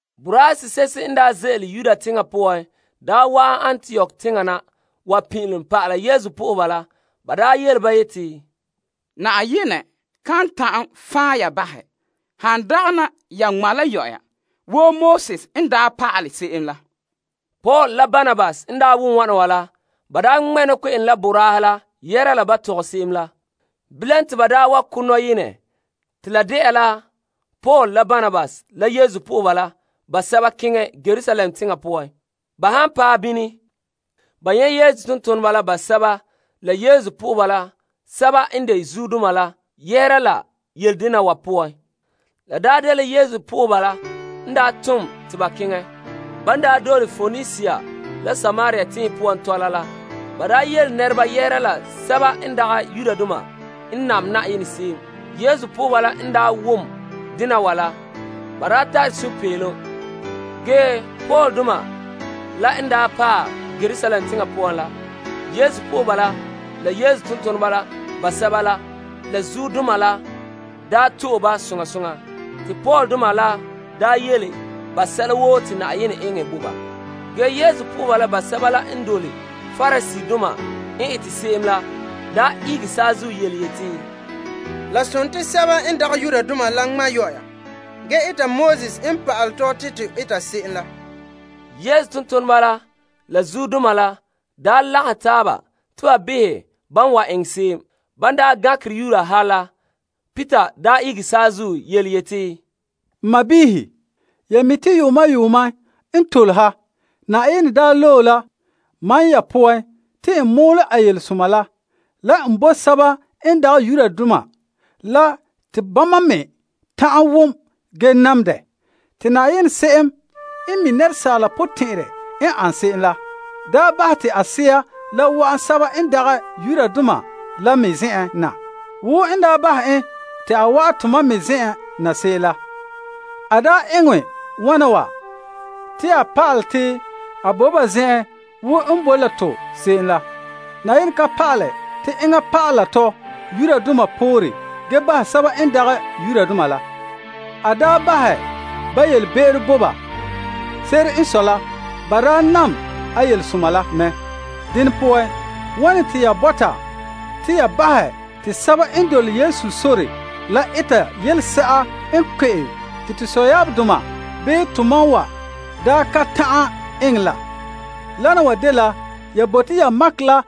Boraahe sese'ehe n ze'ele Yuda teŋa poan wa'an Antiok teŋa na wa pin'ilom pa'ala Yesu nɛreba la. Ba yele ba yeti, Yenɛ kan ta'an fan' ya bahɛ han dagana ya ŋma' la ba boraanɛ wo Moses n daa pa'alɛ se'em la. Paul la Barnabas n wom wana wa la, ba ŋmɛ' nɔkpe'ene la boraahe la yɛhera la ban tɔgɛ se'em la. Bilam te ba wa ko' nɔyenɛ te la de'a la Paul la Barnabas la Yesu nɛreba la basɛba keŋɛ Yerusalem teŋa poan. Ba han paɛ bini ba nyɛ' Yesu tontoneba la basɛba la Yesu po'oheba sɛba n de zuodoma la yɛhera la yele dena wa poan. La dela Yesu lagaŋɔ n tom te ba keŋɛ. Ban dole Poenisia la Samaria tenhen poan tɔla la, ba yele nɛreba yɛhera la sɛba n dagɛ Yudoma n nam Yenɛ se'em. Yesu po'oheba la n wom dena wa la, ba daa tare sunpeelom. Ge Paul doma la n paɛ Yerusalem teŋa poan la, Yesu lagaŋɔ la Yesu tontoneba la basɛba la zuodoma la to'e ba soŋa soŋa. Te Paul doma la yele ba sɛla woo te Yenɛ eŋɛ bo ba. Ge Yesu nɛreba la basɛba la n daa dole Pariseedoma n ete se'em la daa ihege saazuo yeti, La sontii te sɛba n dagɛ Yudoma la ŋmata ge nana Moses pa'alegɔ. Yesu tontoneba la la zuodoma la lagahɛ taaba te ba behɛ ban wan eŋɛ se'em. Ban gankere yuura ha la, Peter ihege saazuo yeti, N sɔɔnrɔ, ya mi' te yuuma yuuma n tole ha, Yenɛ daa loe la mam ya poan te n mɔɔlɛ a Yelesoma la la n bo sɛba n dagɛ Yudoma la te bama me ta'an wom ge nam dɛ. Te Yenɛ se'em n mi' asaala potɛn'ɛrɛ n ane se'em la, daa bahɛ te a Sea la wa'an sɛba n dagɛ Yudoma la me zen'an na wo n daa bahɛ en te a wa'an tomam me zen'an na se'em la. A daa eŋɛ wa'an wa te a pa'alɛ te a boe ba zen'an wo n boe la to se'em la. Yenɛ ka yelehere Yudoma la sɛba n dagɛ Yudoma la. A daa bahɛ ba yelebe'ero bo ba. Se'ere n sɔe la ba daa nam a Yelesoma la mɛ. Dene poan, wane te ya bɔta te ya bahɛ te sɛba n dole Yesu sore la eta yelese'a n kpe'em te to sɔyaabdoma bii tomam wa daa ka ta'an eŋɛ la? Wana wa dela ya bote ya makɛ la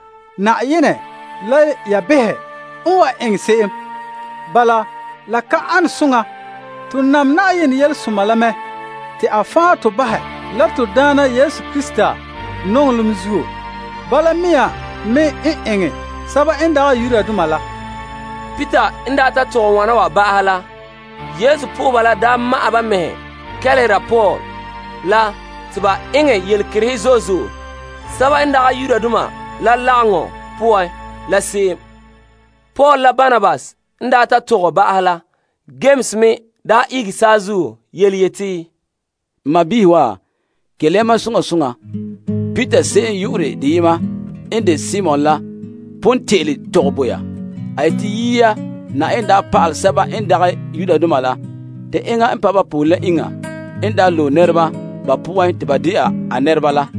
Yenɛ la ya behɛ n wan eŋɛ se'em. Bala la ka an soŋa. To nam Yenɛ Yelesoma la mɛ te a fan' to bahɛ la to Na'ayenɛ Yesu Krista zo'ohogɔ la zuo. Bala mea me n eŋɛ sɛba n dagɛ Yudoma la. Peter n ta tɔgɛ wana wa ba'ahɛ la Yesu nɛreba la ma'ɛn ba mɛhe kelehera Paul la te ba eŋɛ yelekerehe zo'e zo'e sɛba n dagɛ Yudoma la lagaŋɔ poan la se'em. Paul la Barnabas n ta tɔgɛ ba'ahɛ la, Yames me ihege saazuo yeti, N sɔɔnrɔ wa, kelehe ya mam soŋa soŋa. Peter se'em yu'urɛ deyema n de Simon la pon te'ele tɔgɛ bo ya. A yete yia Yenɛ daa pa'alɛ sɛba n dagɛ Yudoma la te enŋa pa' ba pore la enŋa n daa loe nɛreba ba poan te ba de'a a nɛreba la.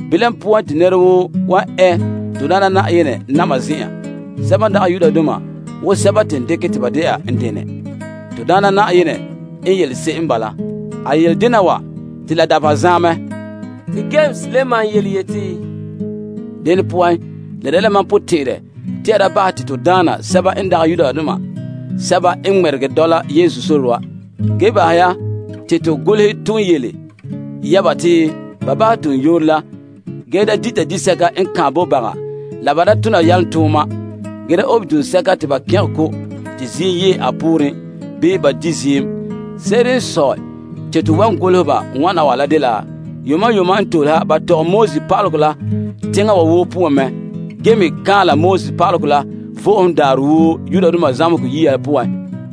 Bilam poan te nɛra woo wan ɛ to Daana Na'ayenɛ na'ma zen'an. Sɛba n dagɛ Yudoma woo sɛba te n dekɛ te ba de'a n denɛ. To Daana Na'ayenɛ n yele se'em n bala. A yele dena wa te la dabeha zaen mɛ. Te Yames la maan yeti, Dene poan la dela mam potɛn'ɛrɛ te ya da bahɛ te to daana sɛba n dagɛ Yudoma sɛba n ŋmɛregɛ dɔla Yesu sore wa. Ge bahɛ ya te to golehɛ ton yele ya ba te ba bahɛ toonyooro la ge da dita disɛka n kaanbɛ bo baga la ba da tona yalomtooma, ge da obe duŋsɛka te ba kɛngɛ ko' te ziim yea a pooren bii ba di' ziim. Se'ere n sɔe te to wan golehɛ ba wana wa la dela yuuma yuuma n tole ha ba tɔgɛ Moses yɛla la teŋa woo poan mɛ, ge me kaanla Pa'alegɔ la Vo'ohogo Daarɛ woo zamehegɔ yia poan.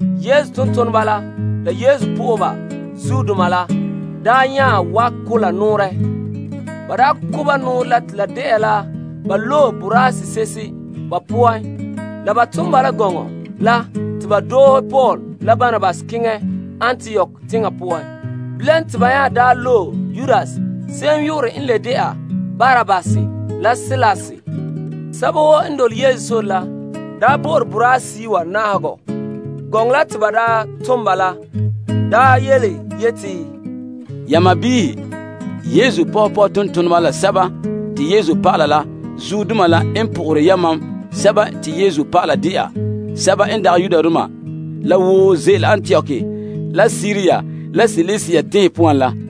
Yesu tontoneba la Yesu lagaŋɔ zuodoma la nya ko' nɔɔrɛ. Ba ko' ba nɔɔrɛ la te la de'a la ba loe boraa se'ehe ba poan la ba ton ba la gɔŋɔ la te ba doohe Paul la Barnabas keŋɛ Antiok teŋa poan. Bilam te ba nya loe Yudas se'em yu'urɛ n le de'a Barsabbas la Silas, sɛba woo n dole Yesu sore la daa bo'ore boraahe seyi' wa na'ahegɔ. Gɔŋɔ la te ba tom ba la daa yeti: Ya sɔɔnrɔ, Yesu pɔhega tontoneba la Yesu dɔlɔba la zuodoma la n po'ohere yamam Yesu dɔlɔba de'a sɛba n dagɛ Yudoma la woo ze'ele Antiok la Siria la Silisia tenhen poan la.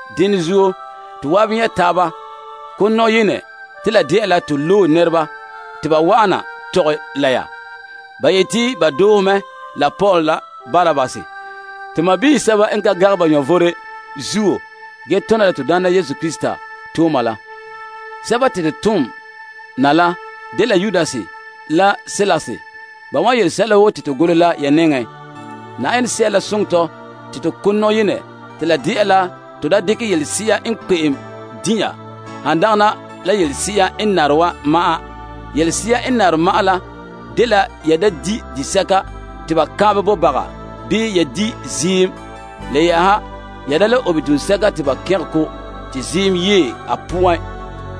Dene zuo, to zan'an nyɛ' taaba ko' nɔyenɛ te la de'a la to loe nɛreba te ba wa'an na tɔgɛ la ya. Ba yete ba doohe mɛ la Paul la Barnabas to sɔɔnrɔ, sɛba n ka gangɛ ba vom zuo ge tona la to Daana Yesu Krista tooma la wana. Bala la, to tom Yudas la Silas te ba wan yele sɛla woo te to golehɛ la ya nɛŋa poan. Yenɛ Sea la soŋɛ tɔ te to ko' nɔyenɛ te la de'a la to da dekɛ yelese'a n kpe'em din' ya han dagana la yelese'a n nare wa ma'an. Yelese'a n nare ma'an la dela ya da di' disɛka te ba kaanbɛ bo baga bii ya di' ziim. Le yɛ'ɛha ya da le obe duŋsɛka te ba kɛngɛ ko' te ziim yee a poan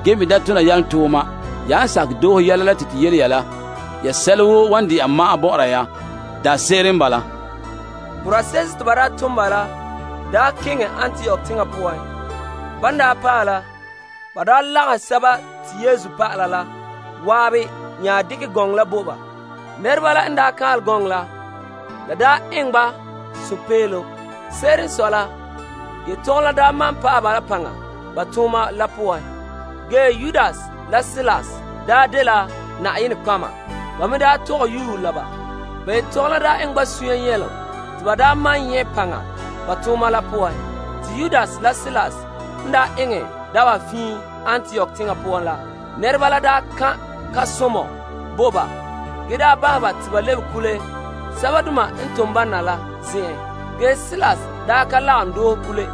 ge me da tona yalomtooma. Ya han sakɛ doohe yɛla la te to yele ya la, ya sɛla woo wan de'a ma'an bɔ'ɔra ya. Daanse'ere n bala. Borase'ehe te ba tom la keŋɛ Antiok teŋa poan. Ban paɛ la, ba lagahɛ Yesu dɔlɔba la zan'an nya dekɛ gɔŋɔ la bo ba. Nɛreba la n kaanlɛ gɔŋɔ la, la eŋɛ ba sunpeelom. Se'ere n sɔe la, yetɔgom la malom pa'ahɛ ba la paŋa ba tooma la poan. Yudas la Silas n de nɔtɔgɔheba me tɔgɛ yuue la ba. Ba yetɔgom la eŋɛ ba sunya nyɛlom te ba malom nyɛ' paŋa ba tooma la poan. Yudas la Silas n eŋɛ dabeha fiin Antiok teŋa poan la, nɛreba la kan' kan'somɔ bo ba ge bahɛ ba te ba lebe kule sɛbadoma n tom ba na la zen'en. Silas ka lagom doohe kule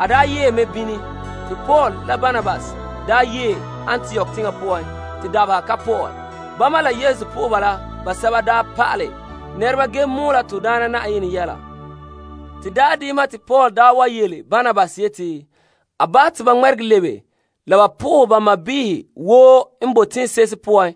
ge yee mɛ bini. Te Paul la Barnabas yee Antiok teŋa poan te dabeha ka pɔ'ɛ. Bama la Yesu po'oheba basɛba pa'alɛ nɛreba ge mɔɔlɛ Na'ayenɛ yɛla. Te daarɛ deyema te Paul yele Barnabas yete a bahɛ te ba ŋmɛregɛ lebe la ba po'ohɛ ba sɔɔnrɔ sɛba woo n bo teŋse'ehe poan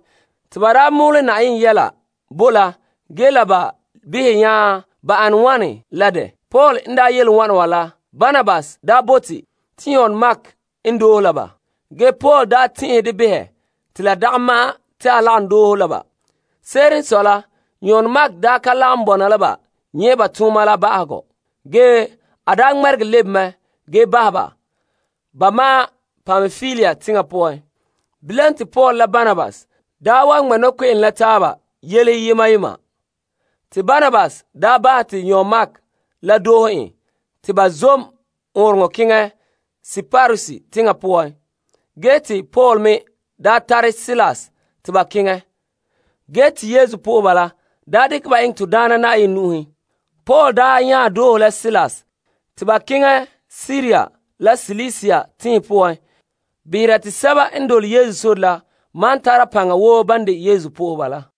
te ba mɔɔlɛ Na'ayenɛ yɛla bo la ge la ba behɛ nya ba ane wane la dɛ. Paul n yele wana wa la, Barnabas bote te Yon Mark n doohe la ba. Ge Paul tɛn'ɛhɛ dɛ behɛ te la dagɛ ma'an te a lagom doohe la ba. Se'ere n sɔe la Yon Mark ka lagom bɔna la ba nyɛ' ba tooma la ba'ahegɔ. Ge a ŋmɛregɛ lebe mɛ ge bahɛ ba ba ma'an Pampilia teŋa poan. Bilam te Paul la Barnabas ŋmɛ' nɔkpe'ene la taaba yelehe yema yema. Te Barnabas bahɛ te Yon Mark la doohe en te ba zom ɔɔnrɔŋɔ kantɛ keŋɛ Kiprus teŋa poan. Ge te Paul me tare Silas te ba keŋɛ. Ge te Yesu nɛreba la dekɛ ba eŋɛ Na'ayenɛ nu'uhen. Paul nya doohe la Silas te ba keŋɛ Siria la Silisia tenhen poan behera te sɛba n dole Yesu sore la malom tara paŋa wo ban de Yesu po'oheba la.